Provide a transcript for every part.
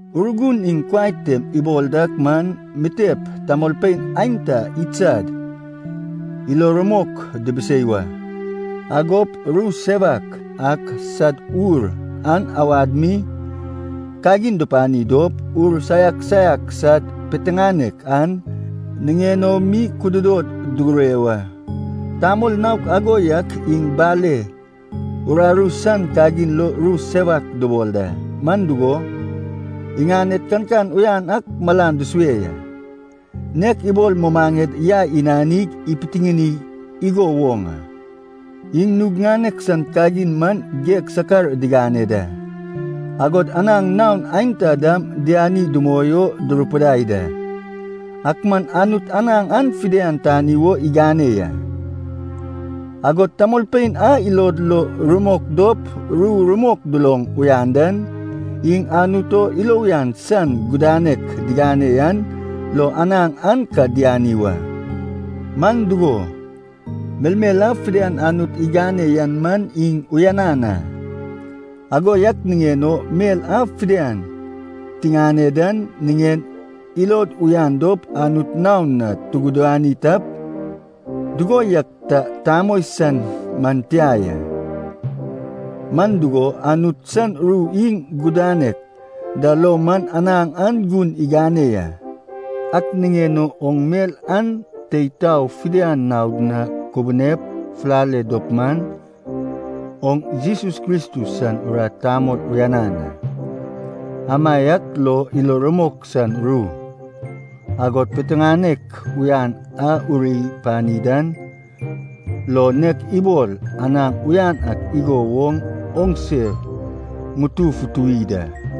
Urgun iŋ kuai tem ibol dak man mitep tamolpein aenta iŋsad ilo rumok dibisei wa. Agop ru sewak ak sad ur an awad mi kagin dupani dop, ur saiak saiak sad piteŋanek an niŋen o mi kududod dugure wa. Tamol naok ago yak iŋ bale uraru san kagin lo ru sewak dubol da, man dugo, iŋaned kankan uyan ak malan dusue ya, nek ibol mumaŋed yai inanig ipitiŋini igo woŋ a. Iŋ nug ŋanek san kagin man geg sakar digane da, agod anaŋ naon aenta dam diani dumoi o durupidai da. Ak man Anut anaŋ an fidian tani wo igane ya. Agod tamolpein a ilod lo rumok dop ru rumok duloŋ uyan dan, iŋ Anut o ilo uyan san gudanek digane yan lo anaŋ an ka diani wa. Man dugo, melmel a fidian Anut igane yan man iŋ uyanan a. Ago yak niŋen o mel a fidian tiŋane dan niŋen ilod uyan dop Anut naon na tugudani tap, dugo yak ta tamoi san man tia ya. Man dugo, Anut san ru iŋ gudanek da lo man anaŋ an gun igane ya. Ak niŋen o oŋ mel an tei tao fidian naod na kubunep fulale dop man, oŋ Jesus Kristus san urat tamol uyanan a. Amaiak lo ilo rumok san ru, agod piteŋanek uyan a uri pani dan lo, nek ibol anaŋ uyan ak igo woŋ oŋse ŋutu futuwi da.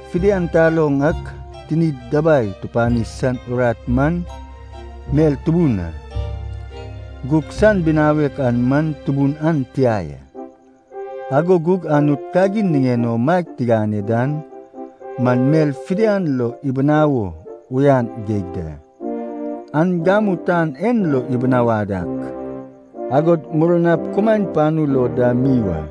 Fidian taloŋ ak tinid dabai tupani san urat man mel tubun a. Gug san binawek an man tubun an tia ya. Ago gug Anut kagin niŋen o maeg gane dan man mel fidian lo ibinawo uyan geig da. An gamu tan en lo ibinawad ak, agod murnap kumaen panu lo dam mi wa.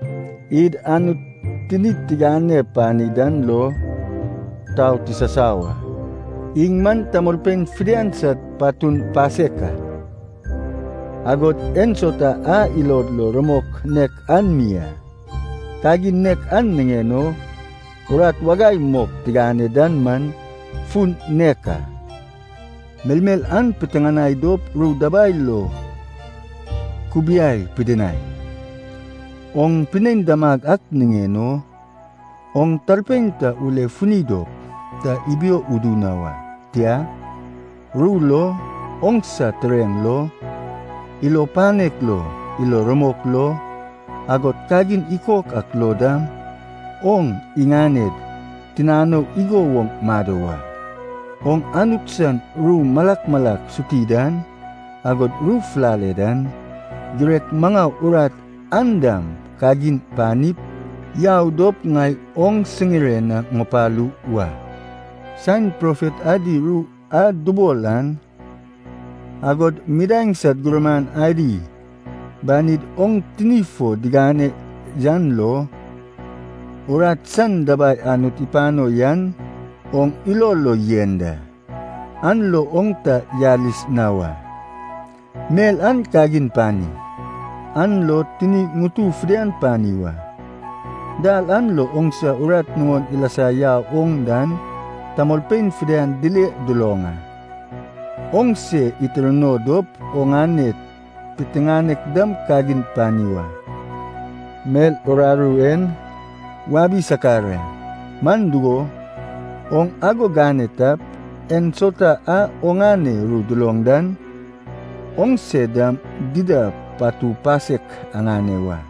Id Anut tinid tigane pani dan lo tau tisasau a. Iŋ man tamolpein fidian sad patun pasek a. Agod ensauta a ilod lo rumok nek an mi a. Kagin nek an niŋen o urat wagai mok tigane dan man fun nek a. Melmel an piteŋanai dop ru dabai lo kubiai pidinai. Oŋ pinein damag ak niŋen o, oŋ talpein ta ule funi dop ta ibio udu na wa. Tia, ru lo, oŋsa tureŋ lo, ilo panek lo, ilo rumok lo, agod kagin ikok ak lo dam oŋ iŋaned tinanou igo woŋ mado wa. Oŋ Anut san ru malak malak suti dan, agod ru fulale dan, girek maŋau urat an dam kagin panip yau dop ŋai oŋ siŋire na ŋupalu wa. Saen profet adi ru a dubol an, agod midaeŋ sad gurman adi banid oŋ tini fo digane yan lo, urat san dabai Anut ipano yan oŋ ilo lo yen da. An lo oŋ ta yalis na wa. Mel an kagin pani, an lo tini ŋutu fidian pani wa. Dal an lo oŋsa urat nuŋon ilasa yau oŋ dan tamolpein fidian dile duloŋ a. Oŋ se itirno dop oŋane piteŋanek dam kagin pani wa. Mel uraru en wabi sakar a, man dugo, oŋ ago gane tap, ensauta a oŋane ru duloŋ dan, oŋse dam dida patu pasek aŋane wa.